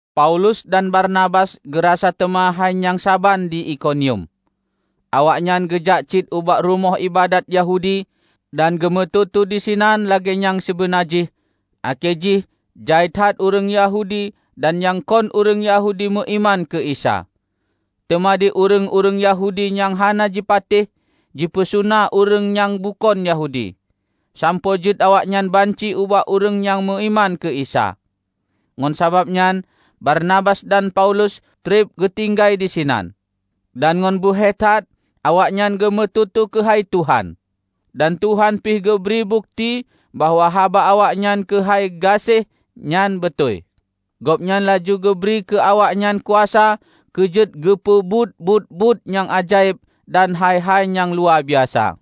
Paulus dan Barnabas geurasa teuma hai nyang saban di Ikonium. Awaknyan geujak cit ubak rumoh iébadat Yahudi dan geumeututoe disinan lagée nyang sibeuna jih akhé jih jai that ureuëng Yahudi dan nyang kon ureuëng Yahudi meuiman keu Isa. Teuma di ureuëng-ureuëng Yahudi nyang hana jipatéh, jipeusuna ureuëng nyang bukon Yahudi, sampoe jeuet awaknyan banci ubak ureuëng nyang meuiman keu Isa. Ngon sabab nyan Barnabas dan Paulus treb geutinggai disinan. Dan ngon beuhe that awaknyan geumeututoe keuhai Tuhan. Dan Tuhan pih geubri bukeuti bahwa haba awaknyan keuhai gaséh nyan beutôi; Gobnyan laju geubri keu awaknyan kuasa keu jeuet geupeubuet buet-buet nyang ajaéb dan hai-hai nyang luwabiasa.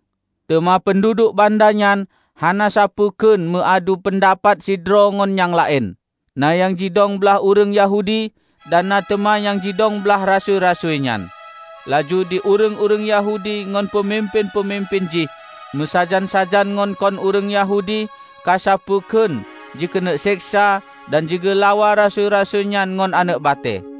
Teuma peunduduek banda nyan hana sapeue kheun meu adu peundapat sidroe ngon nyang laén; na nyang jidong blaih ureuëng Yahudi dan na teuma nyang jidong blaih rasui-rasui nyan. Laju di ureuëng-ureuëng Yahudi ngon peumimpén-peumimpén jih meusajan-sajan ngon kon ureuëng Yahudi ka sapeue kheun jikeuneuk seksa dan jigeulawa rasui-rasui nyan ngon aneuëk batée.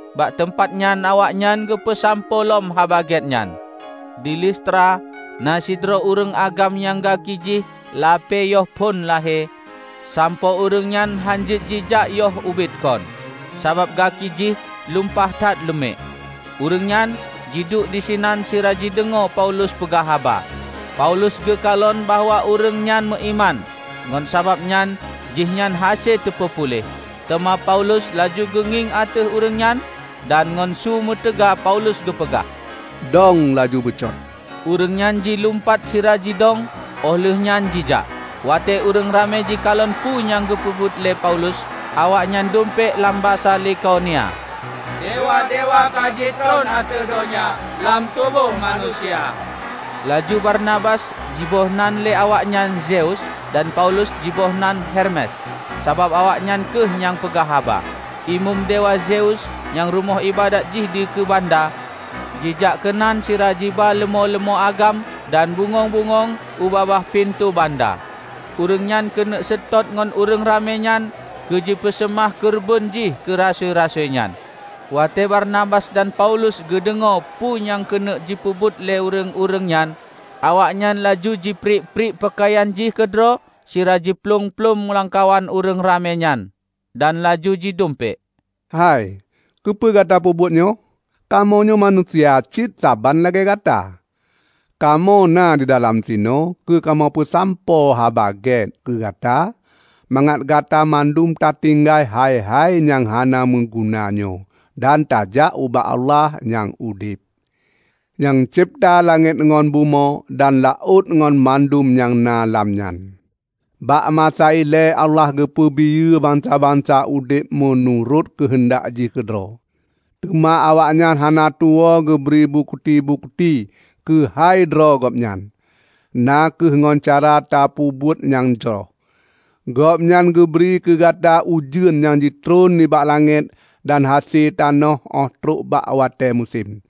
Bak teumpat nyan awaknyan geupeusampoe lom Haba Gét nyan. Di Listra na sidroe ureuëng agam nyang gaki jih lapée yoh phon lahé, sampoe ureuëng nyan hánjeuet jijak yoh ubit kon, sabab gaki jih lumpah that leumiek. Ureuëng nyan jiduek disinan sira jideungoe Paulus peugah haba. Paulus geukalon bahwa ureuëng nyang meuiman ngon sabab nyan jihnyan hase teupeupuléh. Teuma Paulus laju geungieng ateueh ureuëng nyan dan ngon su meutaga Paulus geupeugah, "Dong laju beucot!" Ureuëng nyan jilumpat sira jidong óh lheueh nyan jijak. Watée ureuëng ramé jikalon peue nyang geupeubuet lé Paulus, awaknyan dumpék lam basa Likaonia, "Dewa-dewa ka jitron ateueh donya lam tuboh manusia." Laju Barbanas jiboh nan lé awaknyan Zeus, dan Paulus jiboh nan Hermes, sabab awaknyan kheueh nyang peugah haba. Imeum Dewa Zeus, nyang rumoh iébadat jih dikeue banda, jijak keunan sira jiba leumô-leumô agam dan bungöng-bungöng u babah pintoe banda. Ureuëng nyan keuneuk seutôt ngon ureuëng ramé nyan keu jipeuseumah keureubeuen jih keu rasui-rasui nyan. Watée Barnabas dan Paulus geudeungoe peue nyang keuneuk jipeubuet lé ureuëng-ureuëng nyan, awaknyan laju jipriek-priek peukayan jih keudroe sira jiplueng-plueng lamkawan ureuëng ramé nyan, dan laju jidumpék, "Hai, keupeue gata peubuet nyoe? Kamoe nyoe manusia cit saban lagée Gata! Kamoe na di lam sinoe keu kamoe peusampoe Haba Gét keu gata mangat gata mandum tatinggai hai-hai nyang hana meuguna nyoe dan tajak ubak Allah nyang udeb, nyang cebta langét ngon bumoe dan laôt ngon mandum nyang na lam nyan. Bak masa ilée Allah geupeubiyeu bansa-bansa udeb meunurot keuheundak jih keudroe. Teuma awaknyan hana tuwoe geubri bukeuti-bukeuti keuhai droe Gobnyan, na kheueh ngon cara tapeubuet nyang jroh. Gobnyan geubri keu gata ujeuen nyang jitron nibak langét dan hase tanoh óh trok bak watée musém.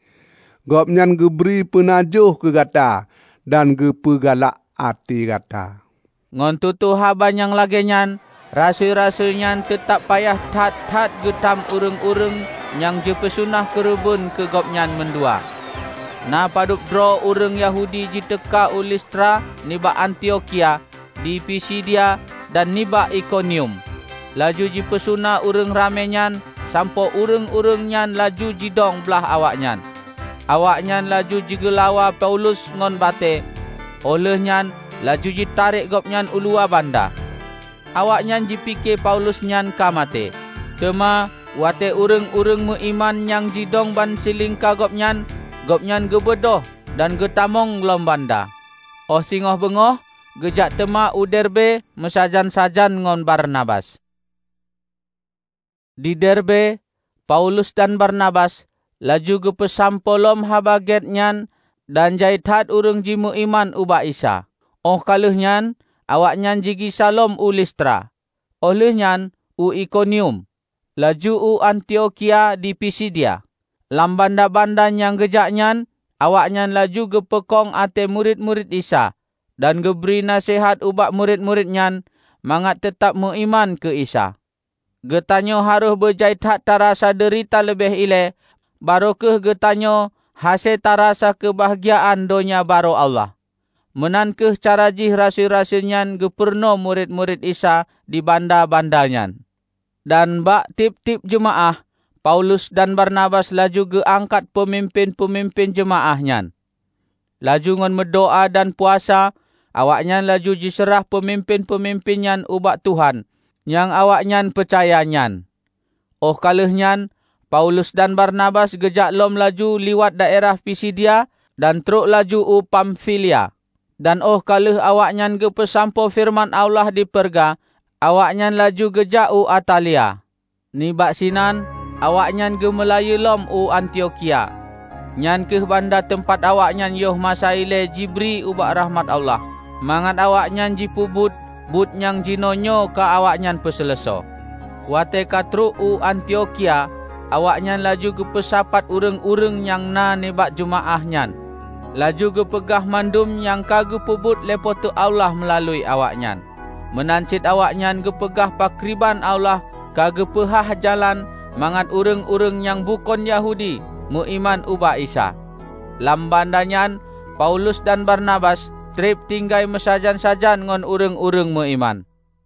Gobnyan geubri peunajoh keu gata dan geupeu galak até gata." Ngon tutoe haba nyang lagée nyan rasui-rasui nyan teutab payah that-that geutam ureuëng-ureuëng nyan jipeuseumah keureubeuen keu gobnyan mandua. Na padub droe ureuëng Yahudi jiteuka u Listra nibak Antiokhia di Pisidia dan nibak Ikonium laju jipeusuna ureuëng ramé nyan sampoe ureuëng-ureuëng nyan laju jidong blaih awaknyan. Awaknyan laju jigeulawa Paulus ngon batée, óh lheueh nyan laju jitarek gobnyan uluwa banda. Awaknyan jipike Paulus nyan ka maté, teuma watée ureuëng-ureuëng meuiman nyan jidong bansilingka gobnyan, gobnyan geubeudôh dan geutamong lom banda. Óh singoh beungoh geujak teuma u Derbe meusajan-sajan ngon Barnabas. Di Derbe, Paulus dan Barnabas laju geupeusampoe lom Haba Gét nyan dan jai that ureuëng jimeuiman ubak Isa. Óh ka lheueh nyan awaknyan jigisa lom u Listra, óh lheueh nyan u Ikonium, laju u Antiokhia di Pisidia. Lam banda-banda nyang geujak nyan awaknyan laju geupeukong até murit-murit Isa dan geubri naseuhat ubak murit-murit nyan mangat teutab meuiman keu Isa, "Geutanyoe harôh beujai that tarasa deurita leubeh ilée, barô kheueh geutanyoe hase tarasa keubahgiaan Donya Barô Allah," meunan kheueh cara jih rasui-rasui nyan geupurunoe murit-murit Isa di banda-banda nyan. Dan bak tieb-tieb jeumaáh, Paulus dan Barnabas laju geuangkat peumimpén-peumimpén jeumaáh nyan. Laju ngon meudoá dan puasa, awaknyan laju jiseurah peumimpén-peumimpén nyan ubak Tuhan nyang awaknyan peucaya nyan. Óh ka lheueh nyan Paulus dan Barnabas geujak lom laju liwat daerah Pisidia dan trok laju u Pamfilia. Dan óh ka lheueh awaknyan geupeusampoe feureuman Allah di Perga, awaknyan laju geujak u Atalia. Nibak sinan awaknyan geumeulayeue lom u Antiokhia. Nyan kheueh banda teumpat awaknyan yoh masa ilée jibri ubak rakhmat Allah, mangat awaknyan jipeubuet buet nyang jinoenyoe ka awaknyan peuseuleusoe. Watée ka trok u Antiokhia, awaknyan laju geupeusapat ureuëng-ureuëng nyang na nibak jeumaáh nyan, laju geupeugah mandum nyang ka geupeubuet lé Po teu Allah meulalu awaknyan. Meunan cit awaknyan geupeugah pakriban Allah ka geupeuhah jalan mangat ureuëng-ureuëng nyang bukon Yahudi meuiman ubak Isa. Lam banda nyan Paulus dan Barnabas treb tinggai meusajan-sajan ngon ureuëng-ureuëng meuiman.